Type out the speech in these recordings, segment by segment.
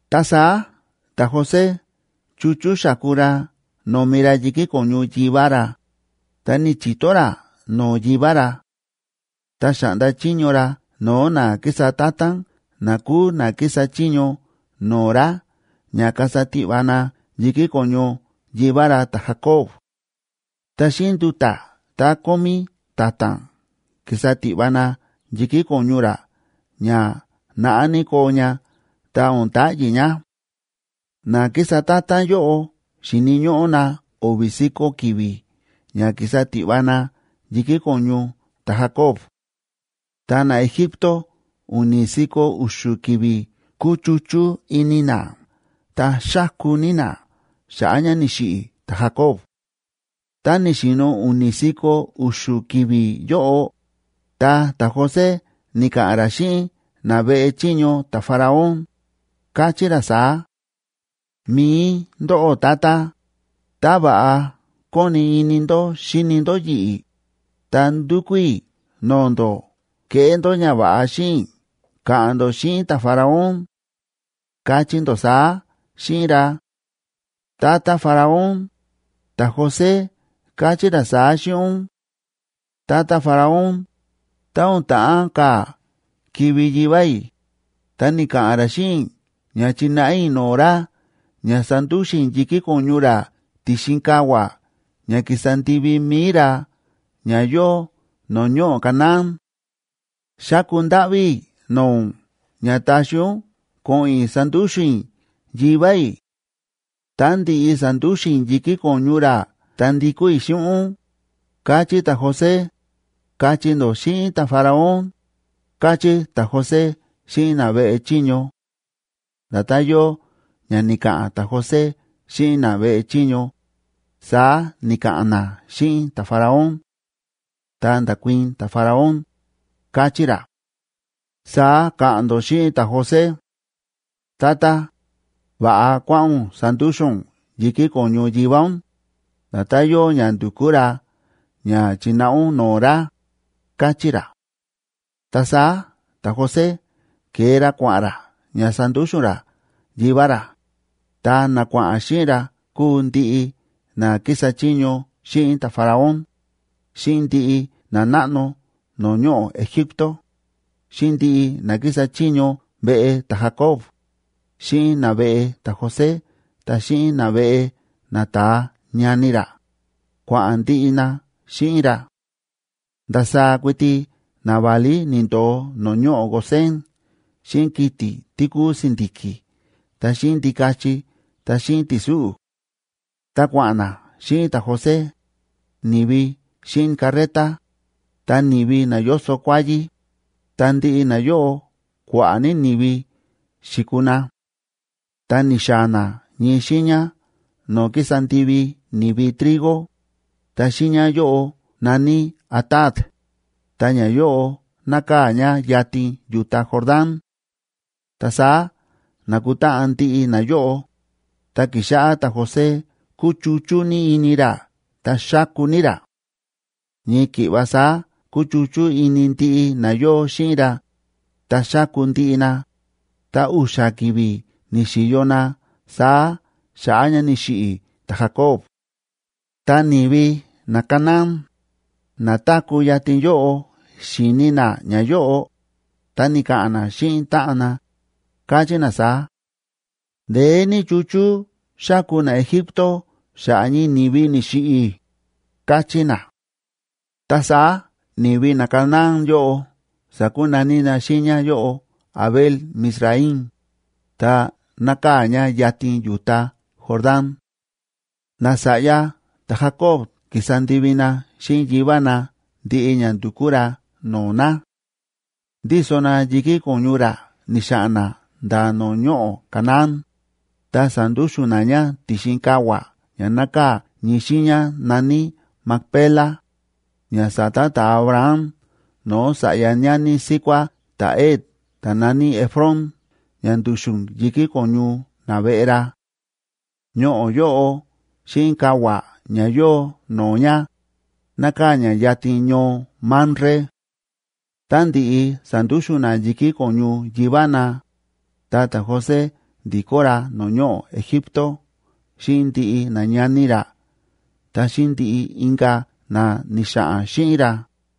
Ta saá ta̱José chu̱chú xa̱ku ra no̱mi ra yi̱kí ko̱ñu yivá ra, ta ni̱chi̱to ra no̱o̱ yivá ra. Ta xa̱ꞌnda chiño ra no̱o̱ na kísa ta̱ta̱n na kúu na kísa chiño no̱o̱ ra ña kasa tiꞌva na yi̱kí ko̱ñu yivá ra ta̱Jacob.a Ta xíꞌin nduta̱ tá kómí ta̱ta̱n ki̱sa tiꞌva na yi̱kí ko̱ñu ra ña naꞌá ní koo ña ta o̱n ta̱ꞌyi̱ ña. Na kísa ta̱ta̱n yóꞌo xi̱ni̱ ñóꞌó na o̱vi̱ si̱ko̱ ki̱vi̱ ña ki̱sa tiꞌva na yi̱kí ko̱ñu ta̱Jacob. Ta naEgipto u̱ni̱ si̱ko̱ u̱xu̱ ki̱vi̱ kúchuchú ini na ta xáku ní na xa̱ꞌa̱ ña ni̱xiꞌi̱ ta̱Jacob. Tá ni̱xi̱no̱ u̱ni̱ si̱ko̱ u̱xu̱ ki̱vi̱ yóꞌo, ta ta̱José ni̱ka̱ꞌa̱n ra xíꞌin na veꞌe chiño ta̱Faraón, káchí ra saá: ―Mi̱i ndóꞌó tata, tá va̱ꞌa kóni ini ndó xíni ndó yi̱ꞌi̱, ta ndúkú i̱ no̱o̱ ndó keꞌé ndó ñava̱ꞌa xíꞌin i̱ ka̱ꞌa̱n ndó xíꞌin ta̱Faraón. Kachí ndó saá xíꞌin ra: “Tata Faraón, ta̱José káchí ra saá xíꞌin ún: Tata Faraón, tá o̱n ta̱ꞌán ka̱ kivi̱ yivá i̱, ta ni̱ka̱ꞌa̱n ra xíꞌin i̱ ña chi̱náꞌa i̱ no̱o̱ ra ña sandúxu̱n i̱ yi̱kí ko̱ñu ra ti̱xin kavua̱ ña ki̱sa ndivi mi̱i ra ña yóo no̱o̱ ñoꞌo̱ Canaán. Xáku ndáꞌví i̱ no̱o̱ ún ña taxi ún ko̱ꞌo̱n i̱ sandúxu̱n i̱ yivá i̱; tá ndi̱ꞌi sa̱ndúxu̱n i̱ yi̱kí ko̱ñu ra ta ndikó i̱ xíꞌin ún, káchí ta̱José”, kachí ndó xíꞌin ta̱Faraón ―káchí ta̱José xíꞌin na veꞌe chiño. Nda̱tán yóo ña ni̱ka̱ꞌa̱n ta̱José xíꞌin na veꞌe chiño, saá ni̱ka̱ꞌa̱n na xíꞌin ta̱Faraón. Ta nda̱kuii̱n ta̱Faraón, káchí ra: ―Saá ka̱ꞌa̱n ndó xíꞌin ta̱José: “Tata, va̱ꞌa kuáꞌa̱n ún sandúxu̱n ún yi̱kí ko̱ñu yivá ún, nda̱tán yóo ña ndu̱kú ra ña chi̱náꞌa ún no̱o̱ ra” ―káchí ra. Ta saá ta̱José ke̱e ra kua̱ꞌa̱n ra ña sandúxu̱n ra yivá ra, ta na kua̱ꞌa̱n xíꞌin ra kúu ndiꞌi na kísa chiño xíꞌin ta̱Faraón, xíꞌin ndiꞌi nanáꞌno no̱o̱ ñoꞌo̱ Egipto, xíꞌin ndiꞌi na kísa chiño veꞌe ta̱Jacob, xíꞌin naveꞌe ta̱José ta xíꞌin naveꞌe nata̱a ñani ra, kua̱ꞌa̱n ndiꞌi na xíꞌin ra. Ndasaá kuiti naválí ni̱ndo̱o no̱o̱ ñoꞌo̱ Gosén xíꞌin kiti̱ tí kúu si̱ndi̱ki̱ ta xíꞌin ndikachi ta xíꞌin ti̱súꞌu̱. Ta kua̱ꞌa̱n na xíꞌin ta̱José, ni̱vi xíꞌin carreta, ta ni̱vi na yóso kuáyí, ta ndiꞌi nayóꞌo kua̱ꞌa̱ ní ni̱vi xi̱kuu na. Ta ni̱xaa̱ na ñii xiiña no̱o̱ kísa ndivi ni̱vi trigo, ta xiiña yóꞌo na̱ní Atad, ta ñayóꞌo nákaa̱ ña yatin yu̱ta Jordán. Ta saá na̱kutáꞌan ndiꞌi na yóꞌo, ta ki̱xáꞌá ta̱José kúchuchú ní ini ra ta xáku ní ra. Ñii ki̱ꞌva saá kúchuchú ini ndiꞌi na yóo xíꞌin ra ta xáku ndiꞌi na, ta u̱xa̱ ki̱vi̱ ni̱xi̱yo na saá xa̱ꞌa̱ ña ni̱xiꞌi̱ ta̱Jacob. Tá ni̱vi naCanaán na táku̱ yatin yóꞌo xi̱ni na ñayóꞌo, ta ni̱ka̱ꞌa̱n na xíꞌin táꞌan na, káchí na saá: ―Ndeé ní chúchú xáku naEgipto xa̱ꞌa̱ ñii ni̱vi ni̱xiꞌi̱ ―káchí na. Ta saá ni̱vi naCanaán yóꞌo sa̱kunaní na xiiña yóꞌo Abel‑mizraim,b ta nákaa̱ ña yatin yu̱ta Jordán. Nasa̱ꞌya ta̱Jacob ki̱sa ndivi na xíꞌin yivá na ndiꞌi ña ndu̱kú ra no̱o̱ na. Ndíso na yi̱kí ko̱ñu ra ni̱xa̱ꞌa̱n na nda̱ no̱o̱ ñoꞌo̱ Canaán, ta sa̱ndúxu̱n na ña ti̱xin kavua̱ ña nákaa̱ ñii xiiña na̱ní Macpela, ña sa̱ta ta̱Abraham no̱o̱ sa̱ꞌya ñani síkuá ta̱Het ta̱ na̱ní Efrón ña ndu̱xu̱n yi̱kí ko̱ñu naveꞌe ra. Ñoꞌo̱ yóꞌo xíꞌin kavua̱ ña yóo no̱o̱ ña, nákaa̱ ña yatin ñoo Mamre. Tá ndi̱ꞌi sa̱ndúxu̱n na yi̱kí ko̱ñu yivá na, ta ta̱José ndi̱kó ra no̱o̱ ñoꞌo̱ Egipto xíꞌin ndiꞌi nañani ra ta xíꞌin ndiꞌi inka̱ na ni̱xa̱ꞌa̱n xíꞌin ra.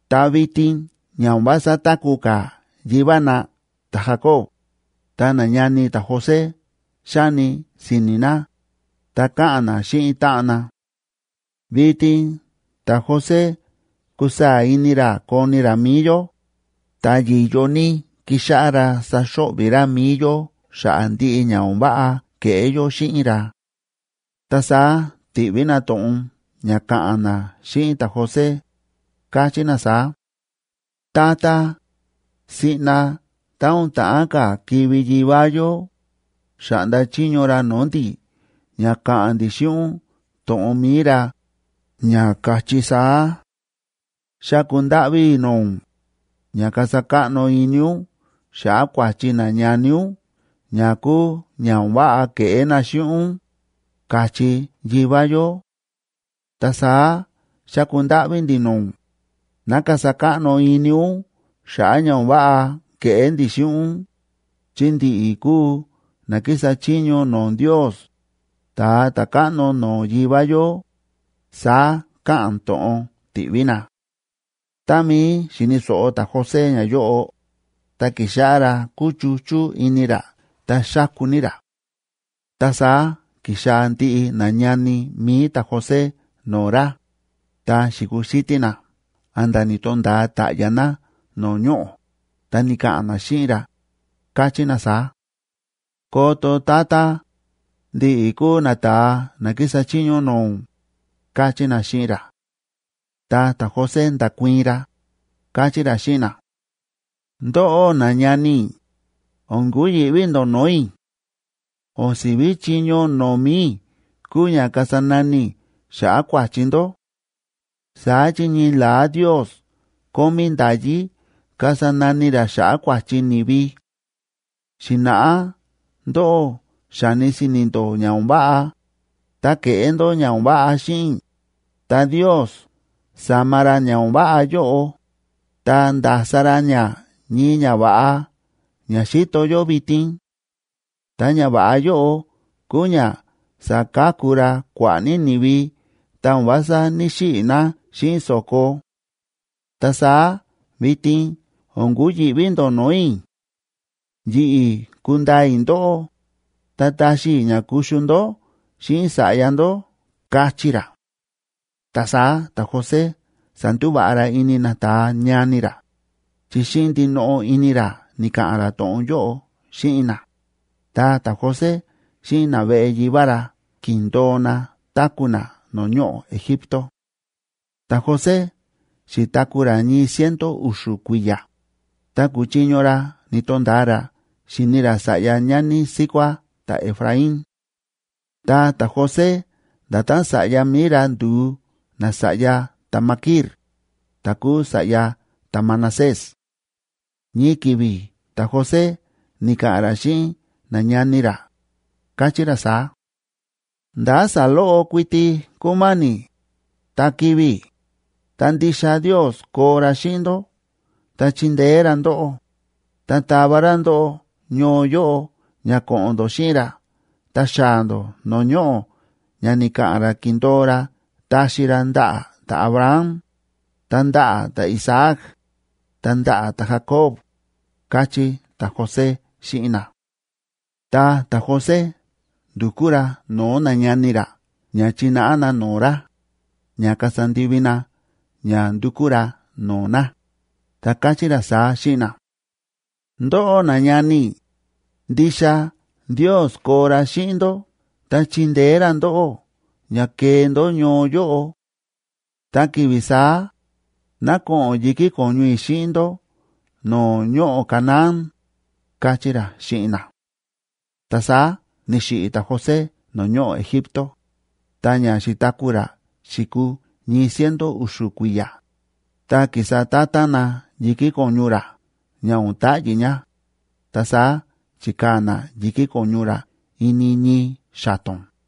Ta vitin ña o̱n vása táku̱ ka̱ yivá na ta̱Jacob, ta nañani ta̱José xáni si̱ni̱ na, ta káꞌa̱n na xíꞌin táꞌan na: ―Vitin ta̱José kusaa̱ ini ra koni ra mi̱i yó, ta yi̱yo ní kixáꞌá ra saxo̱ꞌvi̱ ra mi̱i yó xa̱ꞌa̱ ndiꞌi ña o̱n váꞌa ke̱ꞌé yó xíꞌin ra. Ta saá ti̱ꞌví na to̱ꞌon ña ka̱ꞌa̱n na xíꞌin ta̱José, káchí na saá: ―Tata, siꞌna tá o̱n ta̱ꞌán ka̱ kivi̱ yivá yó, xa̱ꞌnda chiño ra no̱o̱ ndi̱ ña ka̱ꞌa̱n ndi̱ xíꞌin ún to̱ꞌon mi̱i ra, ña ka̱chí saá: “Xáku ndáꞌví i̱ no̱o̱ ún, ña kasa káꞌno ini ún xa̱ꞌa̱ kua̱chi nañani ún ña kúu ña o̱n váꞌa ke̱ꞌé na xíꞌin ún”, ka̱chí yivá yó. Ta saá xáku ndáꞌví ndi̱ no̱o̱ ún, ná kasa káꞌno ini ún xa̱ꞌa̱ ña o̱n váꞌa ke̱ꞌé ndi̱ xíꞌin ún, chi ndi̱ꞌi̱ kúu na kísa chiño no̱o̱ Ndios, ta̱a ta̱káꞌno no̱o̱ yivá yó ―saá káꞌa̱n to̱ꞌon ti̱ꞌví na. Tá mií xi̱ni̱ so̱ꞌo ta̱José ñayóꞌo, ta ki̱xáꞌá ra kúchuchú ini ra ta xáku ní ra. Ta saá ki̱xaa̱ ndiꞌi nañani mi̱i ta̱José no̱o̱ ra, ta xi̱kuxítí na a̱nda̱ ni̱to̱nda̱a ta̱ꞌya̱ na no̱o̱ ñoꞌo̱, ta ni̱ka̱ꞌa̱n na xíꞌin ra, káchí na saá: ―Koto, tata, ndi̱ꞌi̱ kúu nata̱a na kísa chiño no̱o̱ ún ―káchí na xíꞌin ra. Ta ta̱José nda̱kuii̱n ra, káchí ra xíꞌin na: ―Ndóꞌó nañani i̱, o̱n kuyi̱ꞌví ndó no̱o̱ i̱. O̱n si̱ví chiño no̱o̱ mi̱i i̱ kúu ña kasa nani i̱ xa̱ꞌa̱ kua̱chi ndó. Saá chi ñii la̱á Ndios kómí nda̱yí kasa nani ra xa̱ꞌa̱ kua̱chi ni̱vi. Xi̱na̱ꞌá ndóꞌó xa̱ni si̱ni̱ ndó ña o̱n váꞌa, ta ke̱ꞌé ndó ña o̱n váꞌa xíꞌin i̱, ta Ndios sa̱ma ra ña o̱n váꞌa yóꞌo, ta nda̱sa ra ña ñii ñava̱ꞌa ña xíto yó vitin. Ta ñava̱ꞌa yóꞌo kúu ña sa̱ka̱ku ra kua̱ꞌa̱ ní ni̱vi ta o̱n vása ní‑xiꞌi̱ na xíꞌin so̱ko. Ta saá vitin o̱n kuyi̱ꞌví ndó no̱o̱ i̱. Yi̱ꞌi̱ kundaa i̱ ndóꞌó, ta taxi i̱ ña kuxu ndó xíꞌin sa̱ꞌya ndó ―káchí ra. Ta saá ta̱José sa̱ndúva̱ꞌa ra ini nata̱a ñani ra, chi xíꞌin ndinoꞌo ini ra ni̱ka̱ꞌa̱n ra to̱ꞌon yóꞌo xíꞌin na. Ta ta̱José xíꞌin naveꞌe yivá ra ki̱ndo̱o na táku̱ na no̱o̱ ñoꞌo̱ Egipto. Ta̱José xi̱taku̱ ra ñii ciento u̱xu̱ kui̱ya̱, ta ku̱chiño ra ni̱to̱nda̱a ra xi̱ni ra sa̱ꞌya ñani síkuá ta̱Efraín. Ta ta̱José, nda̱tán sa̱ꞌya mi̱i ra ndu̱u nasa̱ꞌya ta̱Maquir, ta̱ kúu sa̱ꞌya ta̱Manasés. Ñii ki̱vi̱ ta̱José ni̱ka̱ꞌa̱n ra xíꞌin nañani ra, káchí ra saá: ―Ndá saloꞌo kuiti kúmáni̱, ta kivi̱ i̱, ta ndixa Ndios koo ra xíꞌin ndó ta chindeé ra ndóꞌó, ta tava ra ndóꞌó ñoo yóꞌo ña ko̱ꞌo̱n ndó xíꞌin ra ta xaa̱ ndó no̱o̱ ñoꞌo̱ ña ni̱ka̱ꞌa̱n ra ki̱ndo̱o ra taxi ra ndaꞌa̱ ta̱Abraham, ta ndaꞌa̱ ta̱Isaac, ta ndaꞌa̱ ta̱Jacob ―káchí ta̱José xíꞌin na. Ta ta̱José ndu̱kú ra no̱o̱ nañani ra ña chináꞌa na no̱o̱ ra, ña kasa ndivi na ña ndukú ra no̱o̱ na, ta káchí ra saá xíꞌin na: ―Ndóꞌó nañani i̱, ndixa Ndios koo ra xíꞌin ndó ta chindeé ra ndóꞌó ña kee ndó ñoo yóꞌo. Tá ki̱vi̱ saá, ná ko̱ꞌo̱n yi̱kí ko̱ñu i̱ xíꞌin ndó no̱o̱ ñoꞌo̱ Canaán ―káchí ra xíꞌin na. Ta saá ni̱xiꞌi̱ ta̱José no̱o̱ ñoꞌo̱ Egipto, ta ña xi̱taku̱ ra xi̱kuu ñii ciento u̱xu̱ kui̱ya̱, ta ki̱sa ta̱ta̱n na yi̱kí ko̱ñu ra ña o̱n ta̱ꞌyi̱ ña, ta saá chi̱kaa̱ na yi̱kí ko̱ñu ra ini ñii xa̱to̱n.